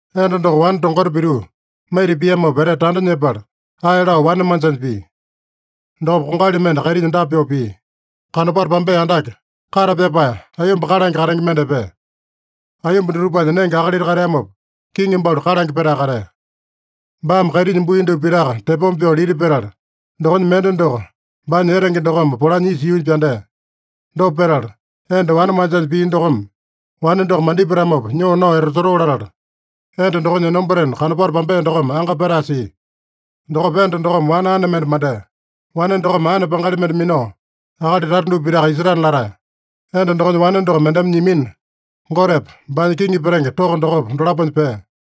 Enda doko wane tongota pituu maita piamopa etete tanda nyepala, ae lao wane manjanya pia. Dokopa kongali mende kaitinya dapa pyoo pia: Kanopato pambea andake, kate pyapae, aiyomba kalange katenge mende epea. Aiyomba dutupanya nenge akalita kateamopa, kiŋi balu kalange petae katea. Baame kaitinya bui dupa pitaka tepoma pyoo lita petala, dokonya mende doko baanya etenge dokome polanya isa yuunya pyandea. Dopa petala, enda wane manjanya pia dokome wane doko mandipatamopa nyoo nao etasotoo latala, enda dokonya enombatena kanopato pambea dokome anga petae sia. Dokopa enda dokome wane ane mende mandea. Wane dokome aene pangali mende minao, akali tata dupa pitaka isetana latae. Enda dokonya wane doko mendeme nyimina, Gotepa, baanya kiŋi petenge toko dokopa, dolaponya pea.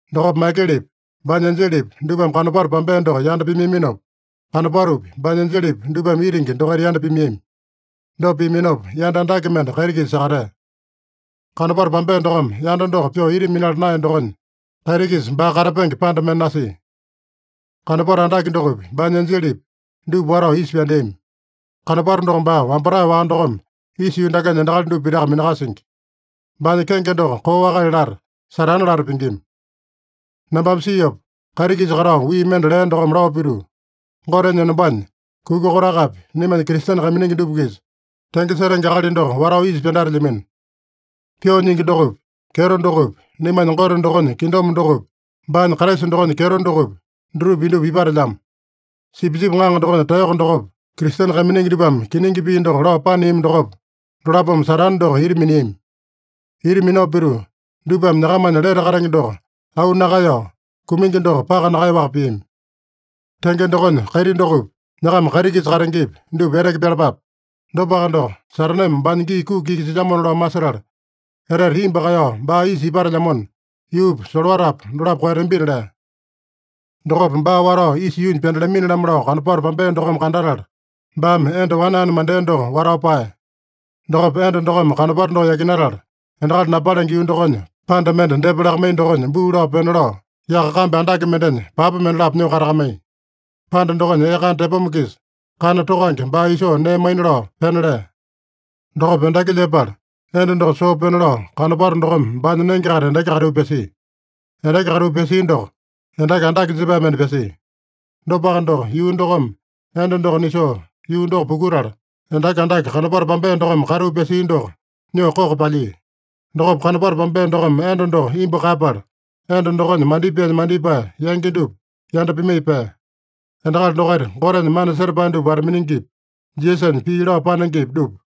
Dokopa Maikelepi, baanya enjelepi, dupame kanopato pambea doko yanda pimaiyaminopa, kanopatopi, baanya enjelepi, dupame itingi dokaita yanda pimaiyami. Dopa piaminopa, yanda andake mende kaiti-kisa sakatea. Kanopato pambea dokome yanda doko pyoo ita minala naeya dokonya, kaiti-kisa baa katapenge panda mende nasia. Kanopato andake dokopi, baanya enjelepi, dupa watao isa pyandeami. Kanopato doko baa wambatae-waka dokome isa yuu dakenya endakali dupa pitaka minakasingi. Baanya kenge doko koo akali lata, Satane lata pingima. Nambame siopa, kaiti-kisa katao wii mende lea dokome lao pituu, “Gotenya enombanya kuka kotakapi naimanya Kristene kaiminingi dupa-kisa tenge setenge akali doko watao isa pyandatelyamino. Pyoo nyingi dokopi, kyeto dokopi, naimanya Gote dokonya kingdom dokopi, baanya Kraisa dokonya kyeto dokopi, dutupa indupa ipatelyamo. Sipisipi Ŋaŋa dokonya taeyoko dokopa, Kristene kaiminingi dupame kiningi pii doko lao paneami dokopa, dolapome Satane doko ita miniami. Ita minao pituu, dupame nyakamanya lete katenge doko auu nakaeyao, kumingi doko paka nakaeyaowaka piami. Tenge dokonya kaiti dokopi, nyakama kaiti-kisa katengepi, dupa eteke pyalapape. Dopaka doko, Sataneme baanya gii kuki iki silyamona lao masetala, etete imbu kaeyao baa isa ipatelyamona, yuupa, solowatapa dolapo koeyatambina” lea. Dokopa baa watao isa yuunya pyandatalamini-lamo lao kanopato pambea dokome kandatala, baame enda wane ane mandea doko watao paeya. Dokopa enda dokome kanopato doko yakinatala, endakali napalenge yuu dokonya panda mende depa lakamaiya dokonya buu lao pena lao, yaka kambi andake mendenya papa mendalapo nyoo katakamaiya. Panda dokonya ee kana tepoma-kisa kana tokange baa isoo nee maina lao pena lea. Dokopa endaki lyepala, enda doko soo pena lao kanopato dokome baanya nenge-kaita endaki katiu pyasia. Endaki katiu pyasia doko, endaki andake jepae mende pyasia. Dopaka doko, yuu dokome enda doko nisoo yuu doko pukutala, endaki andake kanopato pambea dokome katiu pyasia doko nyoo koko palyia. Dokopa kanopato pambea dokome enda doko imbu kaeyapala, enda dokonya mandipaenya mandipae yangi dupa yanda pimaiya pea. Endakali dokaita Gotenya mana setapae dupa wata-miningipi, Jisasanya pii lao panengepi, dupa.